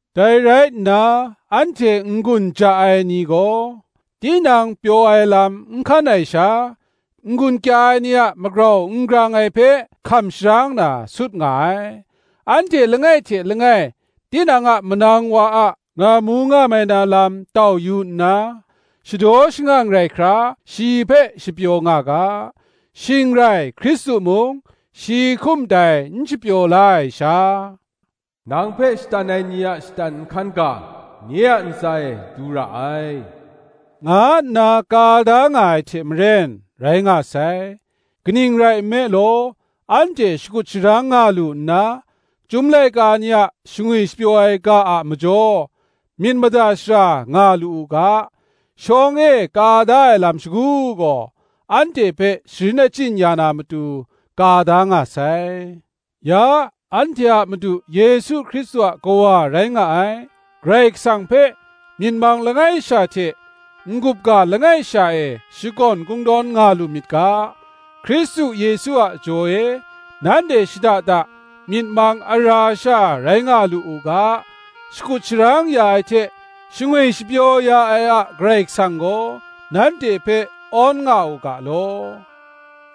Dai rai nna anhte n-gun ja ai ni gaw, tinang pyaw ai lam n hkan ai sha, n-gun kya ai ni a magrau n grang ai hpe hkam sharang na, sut nga ai. Anhte langai hte langai tinang a manang wa a ngamu ngamai na lam tau yu nna, shadaw shangang rai hkra shi hpe shapyaw nga ga. Shing rai Hkristu mung shi hkum dai n shapyaw la ai sha, Nang hpe shatan ai ni a shatan nhkan ga, nye a ntsa e du ra ai, nga nna ka da nga ai hte maren, rai nga sai. Kaning rai nme law, anhte shakut sharang nga lu nna, Chyum laika ni a shangwi shapyaw ai ga a majaw myit mada shara nga lu u ga, shawng e ka da ai lam shagu gaw, anhte hpe sharin achyin ya na matu, ka da nga sai. Ya, anhte a Madu Yesu Hkristu a Kawa rai nga ai, Karai Kasang hpe, myit mang langai sha hte n-gup ga langai sha e shakawn kungdawn nga lu myit ga, Hkristu Yesu a jaw e nanhte shada da myit mang ara sha rai nga lu u ga, shakut sharang ya ai hte shangwi shapyaw ya ai a Karai Kasang gaw, nanhte hpe awn nga u ga law.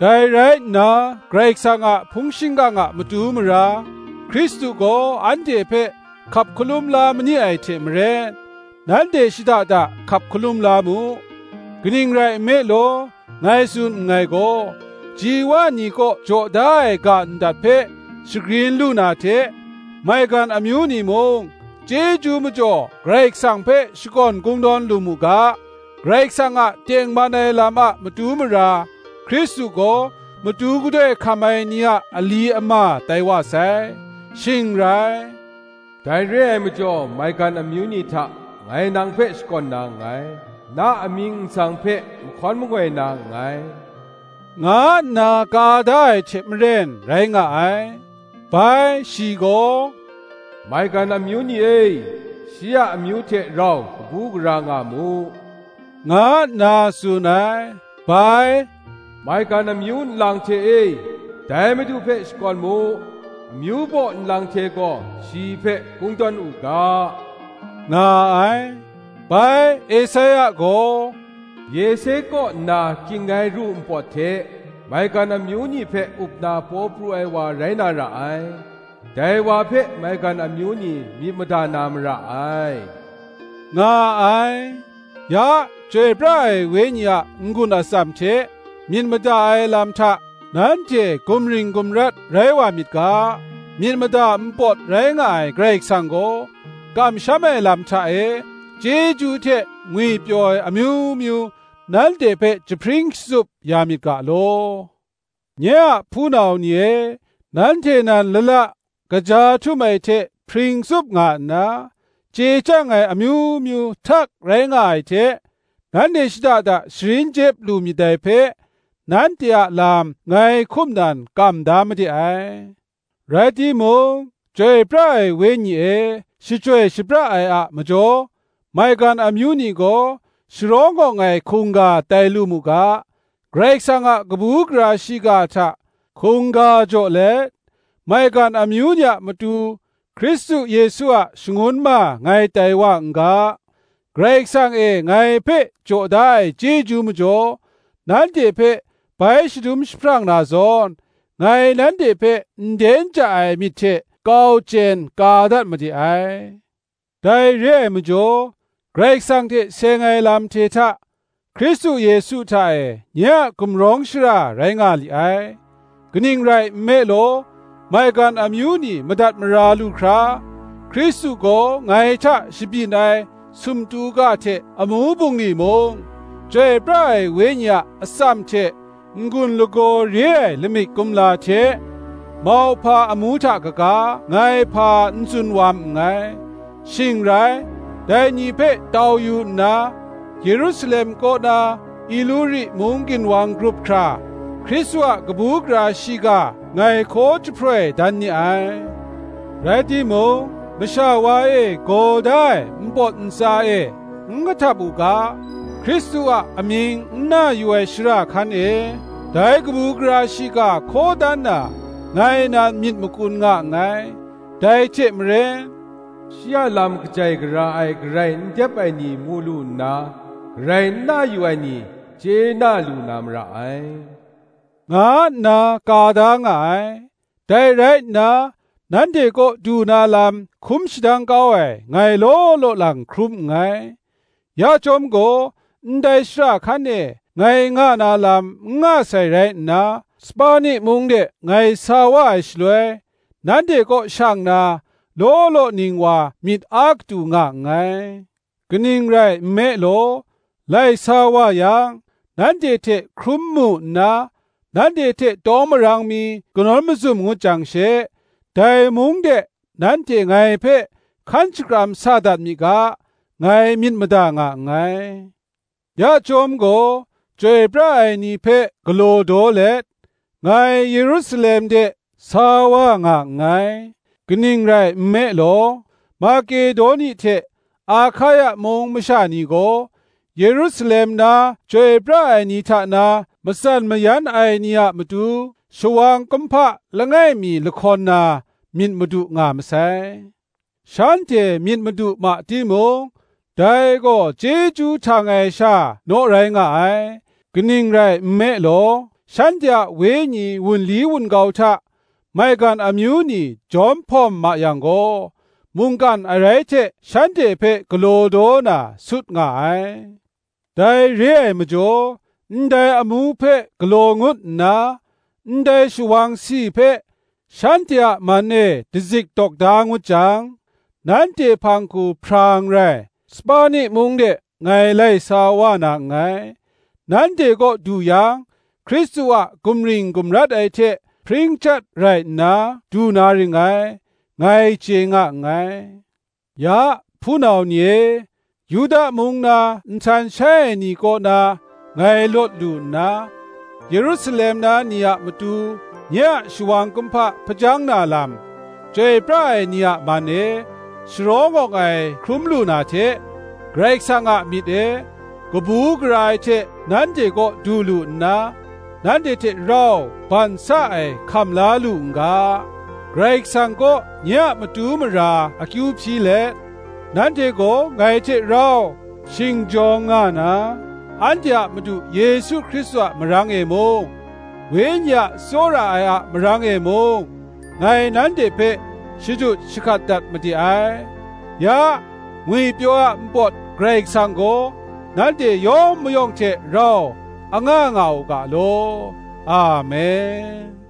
Dai rai nna Karai Kasang a hpung shingkang a matu mara, Hkristu gaw anhte hpe hkap hkalum la mani ai hte maren, nanhte shada da hkap hkalum la mu. Kaning rai nme law, ngai tsun nngai gaw, ji wa ni kaw jaw da ai ga ndat hpe shagrin lu na hte, maigan amyu ni mung chyeju majaw Karai Kasang hpe shakawn kungdawn lu mu ga, Karai Kasang a tengman ai lam a matu mara, Hkristu gaw matu gadoi hkam ai ni a ali ama tai wa sai. Shing rai, “Dai re ai majaw maigan amyu ni hta ngai nang hpe shakawn na nngai, Na amying nsang hpe mahkawn mangoi na nngai,” nga nna ka da ai hte maren rai nga ai. Bai shi gaw, “Maigan amyu ni e, shi a amyu hte rau kabu gara nga mu,” nga nna tsun ai. Bai, “Maigan amyu nlang hte e, dai Madu hpe shakawn mu; Amyu baw nlang hte gaw shi hpe kungdawn u ga, nga ai. Bai Esaia gaw, Yese kaw nna kying ai ru npawt hte, Maigan amyu ni hpe up na paw pru ai wa rai na ra ai: Dai wa hpe maigan amyu ni myit mada na mara ai,” nga ai. Ya, Chyoi pra ai Wenyi a n-gun atsam hte myit mada ai lam hta nanhte gumring gumrat rai wa myit ga, myit mada npawt rai nga ai Karai Kasang gaw, kamsham ai lam hta e, chyeju hte ngwipyaw ai amyu myu nanhte hpe jahpring shatsup ya myit ga law. Nye a hpunau ni e, nanhte nan lala kaja htum ai hte hpring tsup nga nna, chye chyang ai amyu myu htak rai nga ai hte, nanhte shada da sharin jep lu myit dai hpe, nanhte a lam ngai hkum nan kam da made ai. Rai timung, Chyoi pra ai Wenyi e shachyoi shapra ai a majaw, maigan amyu ni gaw sharawng awng ai hkungga tai lu mu ga, Karai Kasang a kabu gara shiga hta hkungga jaw let, maigan amyu ni a matu Hkristu Yesu a shangun ma ngai tai wa n ga; Karai Kasang e ngai hpe jaw da ai chyeju majaw, nanhte hpe bai shadum jahprang na zawn, ngai nanhte hpe nden ja ai myit hte kau chyen ka dat made ai. Dai re ai majaw, Karai Kasang hte seng ai lam hte hta, Hkristu Yesu hta e nye a gumrawng shara rai nga li ai. Kaning rai nme law, maigan amyu ni madat mara lu hkra, Hkristu gaw ngai hta shabyin ai sumtu ga hte amu bungli mung, Chyoi pra ai Wenyi a atsam hte n-gun lagaw re ai lamik kumla hte mauhpa amu hta kaga, ngai hpa n tsun wam nngai. Shing rai, dai ni hpe tau yu nna, Yerusalem kaw na Ituri mung ginwang grup hkra, Hkristu a kabu gara shiga ngai hkaw jahproi dan ni ai. Rai timung, masha wa e gaw da ai npawt ntsa e n kahtap u ga, Hkristu a amying n na yu ai shara hkan e dai kabu gara shiga hkaw dan na, ngai nan myit makun nga nngai. Dai hte maren, “Shi a lam kajai gara ai garai n dep ai ni mu lu nna, Garai n na yu ai ni, chye na lu na mara ai,” nga nna ka da nga ai. Dai rai nna nanhte kaw du na lam hkum shadang kau ai, ngai law law lang hkrum nngai. Ya chyawm gaw ndai shara hkan e ngai nga na lam n nga sai rai nna, Spani mung de ngai sa wa ai shaloi, nanhte kaw shang na, law law ning wa myit a katu nga nngai. Kaning rai nme law, lai sa wa yang, nanhte hte hkrum mu nna, nanhte hte tawng marang mi kanawn mazum ngut jang she, dai mung de nanhte ngai hpe hkan shakram sa dat mi ga, ngai myit mada nga nngai. Ya chyawm gaw, chyoi pra ai ni hpe galaw daw let, ngai Yerusalem de sa wa nga nngai. Kaning rai nme law, Makedoni hte Ahkaia mung masha ni gaw, Yerusalem na chyoi pra ai ni hta na matsan mayan ai ni a matu, shawang kumhpa langai mi lahkawn na, myit madu nga masai. Shanhte myit madu ma timung, dai gaw chyeju htang ai sha naw rai nga ai: kaning rai nme law, shanhte a wenyi wunli wun-gau hta maigan amyu ni jawm hpawm ma yang gaw, mungkan arai hte shanhte hpe galaw daw na, sut nga ai. Dai re ai majaw, ndai amu hpe galaw ngut nna, ndai shawang si hpe shanhte a man e dazik dawk da ngut jang, nanhte hpang hku hprang rai, Spani mung de ngai lai sa wa na nngai. Nanhte kaw du yang, Hkristu a gumring gumrat ai hte hpring chyat rai nna du na ring ngai, ngai chye nga nngai. Ya, hpunau ni e, Yuda mung na nhtan shai ai ni kaw na ngai lawt lu nna, Yerusalem na ni a matu nye a shawang kumhpa hpajang na lam, chyoi pra ai ni a man e, sharawng awng ai hkrum lu na hte; Karai Kasang a myit e, kabu gara ai hte nanhte kaw du lu nna, nanhte hte rau ban sa ai hkam la lu n ga, Karai Kasang kaw nye a matu mara akyu hpyi let, nanhte gaw ngai hte rau shingjawng nga na, anhte a Madu Yesu Hkristu a marang e mung, Wenyi a tsawra ai a marang e mung ngai nanhte hpe shadut shahkat dat made ai. Ya, ngwipyaw ai a npawt Karai Kasang gaw, nanhte yawng mayawng hte rau anga nga u ga law. Amen